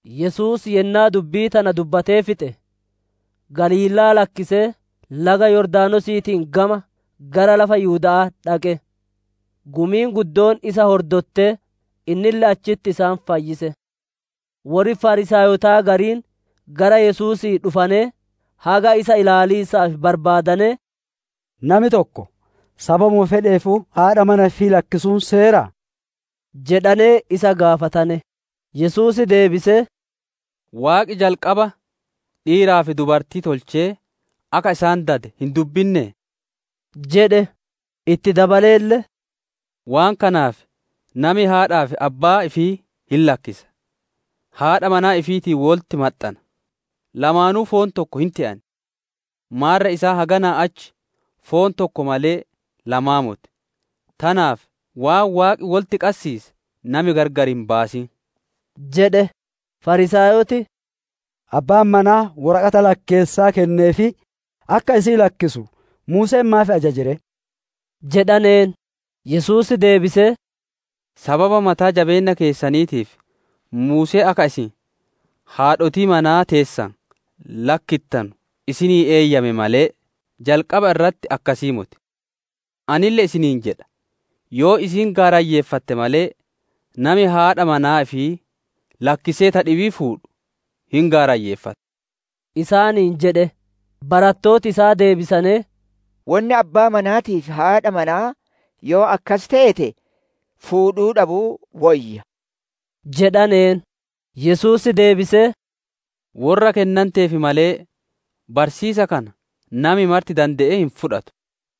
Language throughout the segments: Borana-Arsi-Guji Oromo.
Yesuus yennaa dubbii tana dubbatee fixe, Galiilaa lakkisee laga Yordaanosiitiin gama gara lafa Yihuda'aa dhaqe. Gumiin guddoon isa hordottee, innille achitti isaan fayyise. Worri Fariisaayotaa gariin gara Yesuusii dhufanee, haga isa ilaaliisaaf barbaadanee, «Nami tokko Sababuma fedheefuu haadha manaa ifii lakkisuun seeraa?» jedhanee isa gaafatane. Yesuus deebisee, «Waaqi jalqaba, ‹dhiiraa fi dubartii› tolchee akka isaan dade hin dubbinnee?» jedhe. Itti dabaleelle, «Waan kanaaf nami haadhaa fi abbaa ifii hin lakkisa, haadha manaa ifiitiin wolitti maxxana; lamaanuu foon tokko hin te'an. Maarre isaan haganaa achi foon tokko malee, lamaa moti. Tanaaf waan Waaqi wolitti qassiise nami gargar hin baasin» jedhe. Fariisaayoti, «Abbaan manaa woraqata lakkeessaa kenneefii akka isii lakkisu, Muuseen maaf ajaje ree?» jedhaneen. Yesuus deebisee, «Sababa mataa-jabeenna keessaniitiif Muuseen akka isin haadhotii manaa teessan lakkittanu isinii eeyyame malee, jalqaba irratti akkasii moti. Anille isiniin jedha, yoo isiin gaarayyeeffatte malee, nami haadha manaa ifii lakkisee ta dhibii fuudhu, hin gaarayyeeffata» isaaniin jedhe. Barattooti isaa deebisanee, «Wonni abbaa manaatii fi haadha manaa yoo akkas teete, fuudhuu dhabuu woyya» jedhaneen. Yesuus deebisee, «Worra kennanteef malee, barsiisa kana nami marti dande'ee hin fudhatu.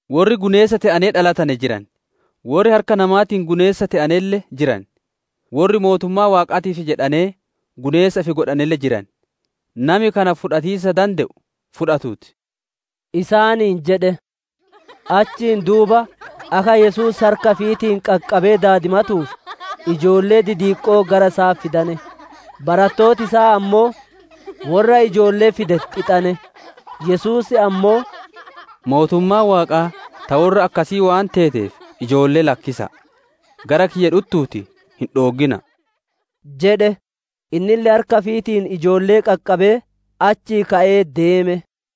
Worri guneessa te'anee dhalatane jiran, worri harka namaatiin guneessa te'anelle jiran, worri mootummaa Waaqaatiif jedhanee guneessa ifi godhaneelle jiran. Nami kana fudhatiisa dande'u fudhatuu ti» isaaniin jedhe. Achiin duuba akka Yesuus harka ifiitiin qaqqabee daadimatuuf ijoollee didiqqoo gara isaa fidane. Barattooti isaa ammoo worra ijoollee fide xixane; Yesuus ammoo, «Mootummaan Waaqaa ta worra akkasii waan teeteef, ijoollee lakkisa'a, gara kiyya dhuttuutii hin dhooggina'a» jedhe. Innille harka ifiitiin ijoollee qaqqabee achii ka'ee deeme.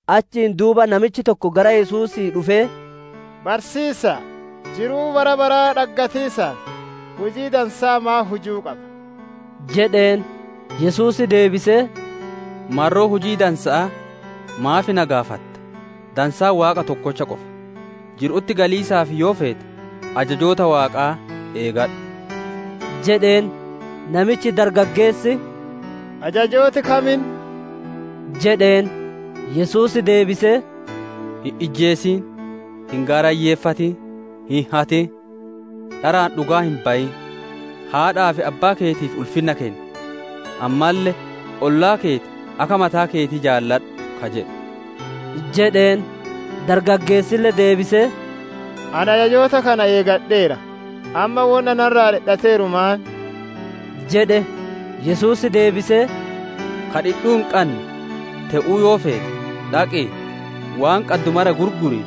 Achiin duuba namichi tokko gara Yesuusii dhufee, «Barsiisa'a, jiruu bara baraa dhaggatiisaaf, hujii dansaa maan hujuu qaba?» jedheen. Yesuus deebisee, «Marroo hujii dansa'aa maaf na gaafatta? Dansaan Waaqa tokkocha qofa. Jiru'utti galiisaaf yoo feete, ajajoota Waaqaa eegadhu» jedheen. Namichi dargaggeessi, «Ajajooti kam inni?» jedheen. Yesuus deebise, « ‹Hin ijjeesin; hin gaarayyeeffatin; hin hatin; dharaan dhugaa hin bayin; haadhaa fi abbaa keetiif ulfinna kenni; ammalle, ollaa keeti akka mataa keetii jaaladhu› ka jedhu» jedheen. Dargageessille deebisee, «Ani ajajoota kana eegadheera; ammaa wonni narraa dhidhateeru maan?» jedhe. Yesuus deebisee, «Ka dhidhuu hin qanne te'uu yoo feete, dhaqii, waan qaddu mara gurgurii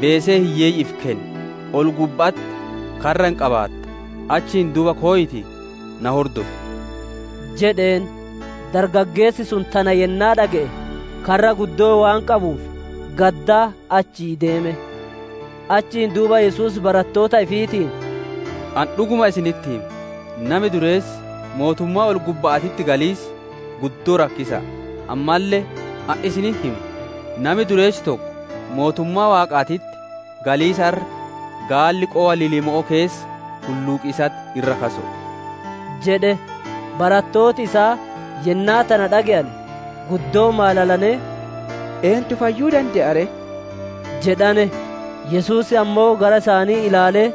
beesee hiyyeeyyi'iif kenni; ol-gubba'atti karra hin qabaatta; achiin duuba koyiitii, na hordofi» jedheen. Dargaggeessi sun tana yennaa dhage'e, karra guddoo waan qabuuf, gaddaa achii deeme. Achiin duuba Yesuus barattoota ifiitiin, «Ani dhuguma isinitti hima, nami dureessi mootummaa ol-gubba'aatitti galiisi guddoo rakkisa'a. Ammalle ani isinitti hima, nami dureessi tokko mootummaa Waaqaatitti galiisa irra gaalli qowa limmo'oo keessa hulluuqiisatti irra kaso'o» jedhe. Barattooti isaa yennaa tana dhage'ane, guddoo maalalanee, «Eentu fayyuu dande'a ree?» jedhane. Yesuus ammoo gara isaanii ilaalee,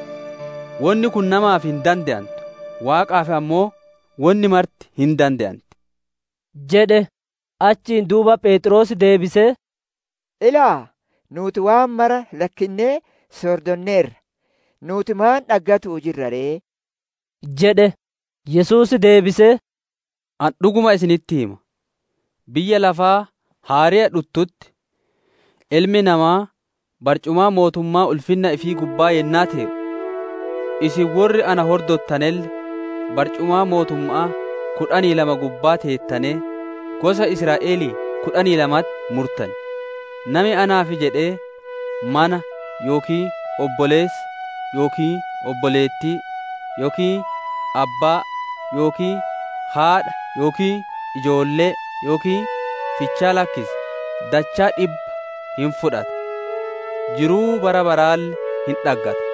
«Wonni kun namaaf hin dande'antu, Waaqaaf ammoo wonni marti hin dande'anti» jedhe. Achiin duuba Pheexroos deebisee, «Ilaa, nuuti waan mara lakkinnee si hordonneerra. Nuuti maan dhaggatu'uu jirra ree?» jedhe. Yesuus deebisee, «Ani dhuguma isinitti hima, biyya lafaa haareya dhuttutti, Ilmi Namaa barcumaa mootummaa ulfinna ifii gubbaa yennaa tee'u, isin worri na hordottanelle barcumaa mootumma'aa kudhanii lama gubbaa teettanee, gosa Israa'elii kudhanii lamatti murtan. Nami naaf jedhee mana yookiin obboleessa yookiin obboleettii yookiin abbaa yookiin haadha yookiin ijoollee yookiin fichaa lakkise, dachaa dhibba hin fudhata; jiruu bara baraalle hin dhaggata.